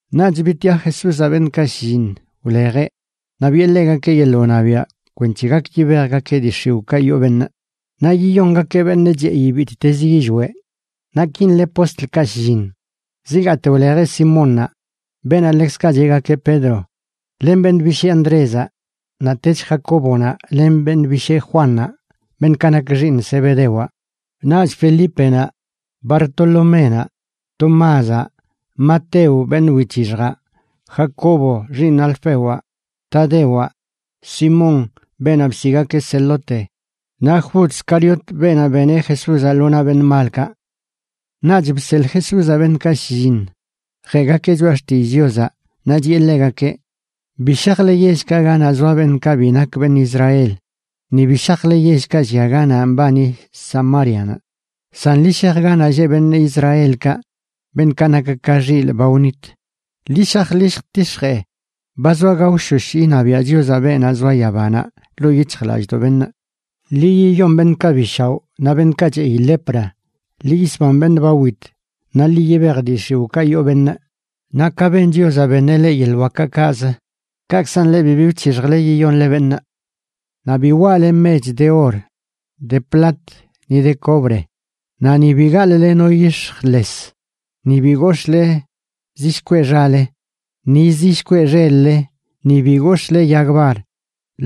Naꞌch bitiꞌa Jesúzaꞌ beṉꞌkaꞌ shlliṉ wlejeꞌ naꞌ biꞌe ḻegakeꞌ yeḻꞌ wṉabiaꞌ kwenc̱he gak yibejgakeꞌ dii x̱iwꞌkaꞌ yoo beṉꞌ, naꞌ yiyongakeꞌ beṉꞌ cheꞌi bittezə yillweꞌ. Naꞌ kin le postlkaꞌ shlliṉ: zigaate wlejeꞌ Simónnaꞌ, beenaꞌ ḻekzkaꞌ cheꞌgakeꞌ Pedro, len beṉꞌ bishee Andrézaꞌ, naꞌtech Jacóbonaꞌ len beṉꞌ bishee Juannaꞌ, beṉꞌkaꞌ nak xiiṉ Zebedewaꞌ, naꞌch Felípenaꞌ, Bartoloménaꞌ, Tomázaꞌ, Mateo, beṉꞌ wic̱hixjaꞌ, Jacobo xiiṉ Alfewaꞌ, Tadewaꞌ, Simón, beenaꞌ bsiꞌgakeꞌ Zelote, naꞌ Jud Scariotaꞌ, beenaꞌ beneꞌ Jesúzaꞌ lo naꞌ beṉꞌ malkaꞌ. Naꞌch bseḻꞌ Jesúzaꞌ beṉꞌkaꞌ shlliṉ jeꞌgakeꞌ choꞌa xtillꞌ Chiozaꞌ, naꞌ chiꞌe ḻegakeꞌ: ―Bi shajle yellkaꞌ ganaꞌ zoa beṉꞌkaꞌ bi nak beṉꞌ Israel, ni bi shajle yellkaꞌ llia ganaꞌ mbani Samárianaꞌ. San ḻi shaj ganaꞌ lleꞌ beṉꞌ Israelkaꞌ, beṉꞌkaꞌ nak ka xilꞌ ba wnit. Ḻi shaj ḻi lljtix̱jee ba zoa gaoshosh iṉabiaꞌ Chiozaꞌ beenaꞌ zoa yabanaꞌ ḻoo yic̱hjlallꞌdoꞌ beṉꞌ. Ḻi yiyon beṉꞌkaꞌ bi shaoꞌ naꞌ beṉꞌkaꞌ cheꞌi lepra, ḻi yisban beṉꞌ ba wit, naꞌ ḻi yibej dii x̱iwꞌkaꞌ yoo beṉꞌ. Naꞌ ka beṉ Chiozaꞌ, beṉeꞌ leꞌ yeḻꞌ wakaꞌ kaꞌz, kaꞌkzan leꞌ bibi wc̱hixjle yiyonle beṉꞌ. ’Naꞌ bi waꞌle mech de or, de plat ni de cobre. Naꞌ ni bi gaḻꞌle no yix̱j les, ni bi gox̱ꞌle zi shkweꞌ xale, ni zi shkweꞌ xel-le, ni bi gox̱ꞌle yag bar,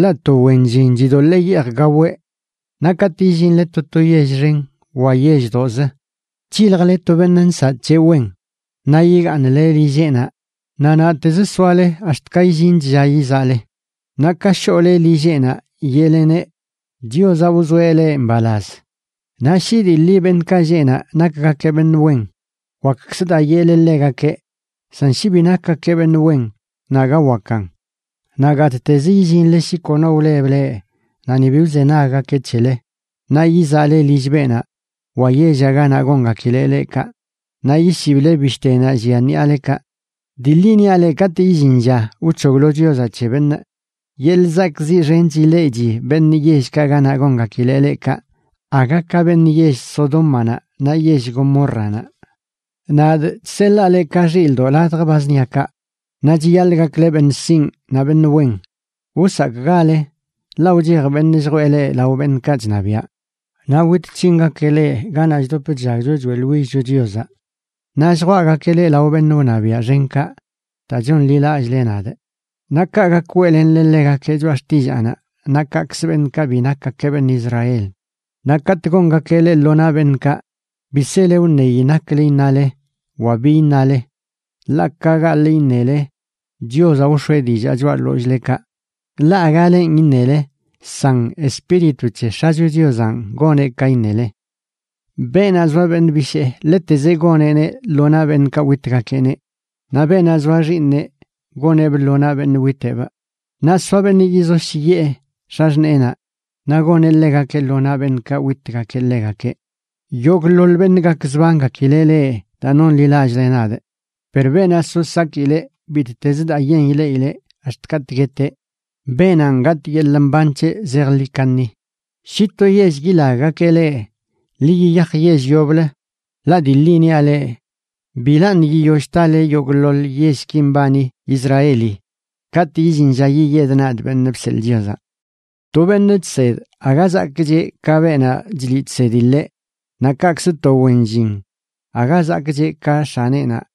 ḻaꞌ to wen llin chidoḻee yeej gaweꞌ. ’Naꞌ katꞌ illinle to to yell xen wa yelldoꞌzə, c̱hiljle to beṉꞌ nsaꞌ c̱heꞌ wen, naꞌ yigaaṉle lilleꞌnaꞌ naꞌ naꞌtezə soale ax̱t ka illinch lla yizaꞌle. Naꞌ ka shoꞌle lilleꞌnaꞌ yeꞌleneꞌ: “Chiozaꞌ wzoeꞌ leꞌ mbalaz.” Naꞌ shi dii ḻi beṉꞌkaꞌ lleꞌ naꞌ nakgakeꞌ beṉꞌ wen, wakkzə daa yeꞌle ḻegakeꞌ; san shi bi nakgakeꞌ beṉꞌ wen, naꞌ aga wakan. Naꞌ gattezə illinle shi kono wleb leꞌ naꞌ ni bi wzenaggakeꞌ c̱hele, naꞌ yizaꞌle lill beenaꞌ wa yellaꞌ ganaꞌ gongakileꞌ leꞌ kaꞌ naꞌ yishible bishtenaꞌ llia ṉiꞌalekaꞌ. Dii ḻi niaꞌ leꞌ, katꞌ illin lla wc̱hoglo Chiozaꞌ c̱he beṉꞌ, yeḻꞌ zakꞌziꞌ xench ileꞌchi beṉꞌ yellkaꞌ ganaꞌ gongakileꞌ leꞌ kaꞌ aga ka beṉꞌ yell Sodómanaꞌ naꞌ yell Gomórranaꞌ. ’Nadꞌ chseḻaa leꞌ ka xildoꞌ ladj ba zṉiakaꞌ. Naꞌ chiyaḻꞌ gakle beṉꞌ sinꞌ naꞌ beṉꞌ wen. Wsakꞌgale, ḻaꞌ wchej beṉꞌ lljwee leꞌ lao beṉꞌkaꞌ chṉabiaꞌ naꞌ wit c̱hingakeꞌ leꞌ ganaꞌ chdop chllagcho choeꞌḻwillcho Chiozaꞌ. Naꞌ lljwaꞌgakeꞌ leꞌ lao beṉꞌ wṉabiaꞌ xenkaꞌ daa chonḻilallꞌle nadꞌ, naꞌ kaꞌ gak weꞌlenle ḻegakeꞌ choꞌa xtillaanaꞌ naꞌ kaꞌkzə beṉꞌkaꞌ bi nakgakeꞌ beṉꞌ Israel. Naꞌ katꞌ gongakeꞌ leꞌ lo naꞌ beṉꞌkaꞌ, bi sele wṉeyi naklə iṉale wa bi iṉale, ḻaꞌ ka gaḻꞌ iṉele, Chiozaꞌ wx̱oeꞌ dillaa choꞌa ḻollꞌlekaꞌ. Ḻaꞌ aga lenꞌ iṉele, san Espíritu c̱he X̱acho Chiozanꞌ goneꞌ ka iṉele. ’Beenaꞌ zoa beṉꞌ bishee ḻetezeꞌ goneꞌneꞌ lo naꞌ beṉꞌkaꞌ witgakeꞌneꞌ, naꞌ beenaꞌ zoa xiiṉeꞌ goneꞌbꞌ lo naꞌ beṉꞌ witeꞌbꞌ. Naꞌ soa beṉꞌ yizoshyiꞌe x̱axṉeenaꞌ naꞌ goneꞌ ḻegakeꞌ lo naꞌ beṉꞌkaꞌ witgakeꞌ ḻegakeꞌ. Yogꞌḻoḻ beṉꞌ gakzbangakileꞌ leꞌ daa nonḻilallꞌle nadꞌ, per beenaꞌ so sakileꞌ bittezə daa yen ileꞌileꞌ ax̱t katꞌ gueteꞌ, beenanꞌ gatꞌ yeḻꞌ mban c̱heꞌ zejḻi kaṉi. Shi to yell yilaggakeꞌ leꞌ, ḻi yiyaj yell yoblə. Ḻaꞌ dii ḻi niaꞌ leꞌ bilaṉꞌ yiyoll tale yogꞌḻoḻ yellki mbani Israeli katꞌ illin lla yiyedꞌ nadꞌ, Beṉꞌ Bseḻꞌ Chiozaꞌ. ’To beṉꞌ chsed aga zakꞌcheꞌ ka beenaꞌ chliꞌ chsedi ḻeꞌ, naꞌ kaꞌkzə to wen llin aga zakꞌcheꞌ ka x̱aneꞌnaꞌ.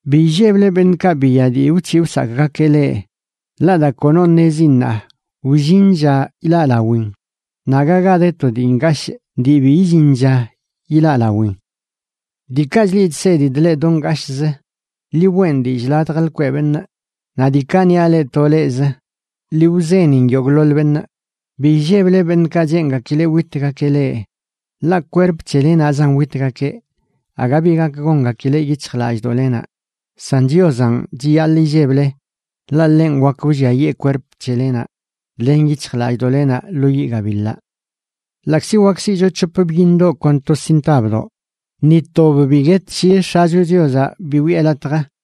Bi illeble beṉꞌkaꞌ biya dii wc̱hiꞌ wsakꞌgakeꞌ leꞌ. Ḻaꞌ daa kono ṉezi ṉaa, wllin lla ilaꞌlawin, naꞌ aga ga de to dii ngashꞌ dii bi illin lla ilaꞌlawin. Diikaꞌ chliꞌ chsedidꞌ leꞌ do ngashꞌzə, ḻi weꞌn dillꞌ ladj lkweꞌ beṉꞌ. Naꞌ diikaꞌ niaꞌ leꞌ to leꞌzə, ḻi wzenin yogꞌḻoḻ beṉꞌ. Bi illeble beṉꞌkaꞌ cheengakileꞌ witgakeꞌ leꞌ, ḻaꞌ kwerp c̱hele naꞌzan witgakeꞌ, aga bi gak gongakileꞌ yic̱hjlallꞌdoꞌlenaꞌ. San Chiozanꞌ chiyaḻꞌ illeble, ḻaꞌ ḻenꞌ wakə wlliayee kwerp c̱helenaꞌ len yic̱hjlallꞌdoꞌlenaꞌ lo yiꞌ gabiḻaꞌ. ’Ḻaꞌkzi wak siꞌcho c̱hop byiṉdoꞌ kon to sintabdoꞌ, ni tob bi guet shi X̱acho Chiozaꞌ bi wiꞌe latj.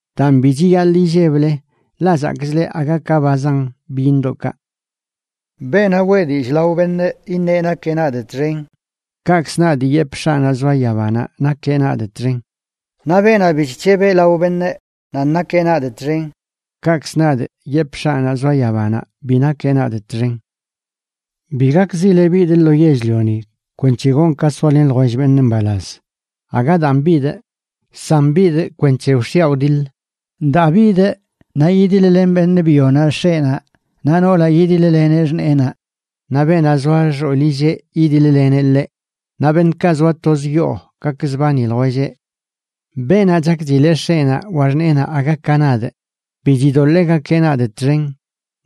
Daan bi chiyaḻꞌ illeble, ḻaꞌ zakꞌch leꞌ aga ka ba zan byiṉdoꞌkaꞌ. ’Beenaꞌ weꞌ dillꞌ lao beṉꞌ iṉeꞌ nakeꞌ nadꞌ txen, kaꞌkzə nadꞌ yepꞌ X̱aꞌnaꞌ zoa yabanaꞌ nakeꞌ nadꞌ txen. Naꞌ beenaꞌ bi chc̱heb lao beṉꞌ nan nakeꞌ nadꞌ txen, kaꞌkzə nadꞌ yepꞌ X̱aꞌnaꞌ zoa yabanaꞌ bi nakeꞌ nadꞌ txen. ’Bi gakzile bidꞌ lo yell-lioni kwenc̱he gonꞌ ka soalen ljwell beṉꞌ mbalaz. Aga daan bidꞌ, san bidꞌ kwenc̱he wx̱iaꞌ wdiḻ. Daa bidꞌ naꞌ yidiḻ-len beṉꞌ byonaꞌ x̱eꞌnaꞌ naꞌ noolaꞌ yidiḻ-leneꞌ xṉeenaꞌ, naꞌ beenaꞌ zoa xoolilleꞌ yidiḻ-leneꞌ ḻeꞌ. Naꞌ beṉꞌkaꞌ zoa toz yoo gakzbani ljwelleꞌ. ’Beenaꞌ chakchileꞌ x̱eꞌnaꞌ wa xṉeenaꞌ aga ka nadꞌ, bi chidoḻee gakeꞌ nadꞌ txen,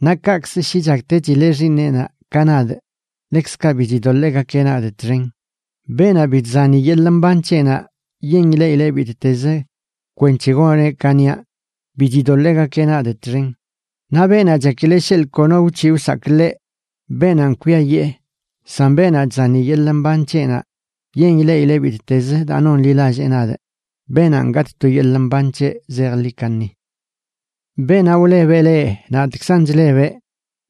naꞌ kaꞌkzə shi chaktechileꞌ xiiṉeꞌnaꞌ ka nadꞌ, ḻekzkaꞌ bi chidoḻee gakeꞌ nadꞌ txen. Beenaꞌ bi chzani yeḻꞌ mban c̱heꞌnaꞌ yen ileꞌileꞌ bittezə kwenc̱he goneꞌ ka niaꞌ, bi chidoḻee gakeꞌ nadꞌ txen. Naꞌ beenaꞌ chakileꞌ sheḻꞌ kono wc̱hiꞌ wsakꞌ ḻeꞌ, beenanꞌ kwiayee. San beenaꞌ chzani yeḻꞌ mban c̱heꞌnaꞌ yen ileꞌileꞌ bittez daa nonḻilallee nadꞌ, beenanꞌ gatꞌ to yeḻꞌ mban c̱heꞌ zejḻi kaṉi. ’Beenaꞌ wlebeꞌ leꞌ, nadꞌkzan chlebeꞌ.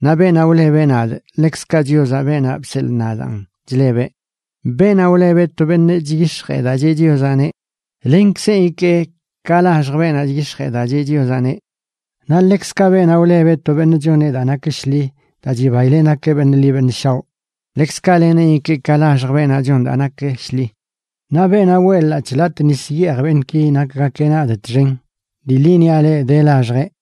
Naꞌ beenaꞌ wlebeꞌ nadꞌ ḻekzkaꞌ Chiozaꞌ, beenaꞌ bseḻꞌ nadaan, chlebeꞌ. Beenaꞌ wlebeꞌ to beṉꞌ chyix̱jee daa cheꞌ Chiozaꞌneꞌ, lenkzenꞌ ikee ka laxj beenaꞌ chyix̱jee daa cheꞌ Chiozaꞌneꞌ. Naꞌ ḻekzkaꞌ beenaꞌ wlebeꞌ to beṉꞌ choneꞌ daa nak shḻi daa chibaileꞌ nakeꞌ beṉꞌ ḻi beṉꞌ shaoꞌ, ḻekzkaꞌ leneꞌn ikee ka laxj beenaꞌ chon daa nak shḻi. Naꞌ beenaꞌ weꞌ ḻaꞌc̱hꞌ latꞌ nis yeej beṉꞌki nakgakeꞌ nadꞌ txen, dii ḻi niaꞌ leꞌ, de laxjeꞌ.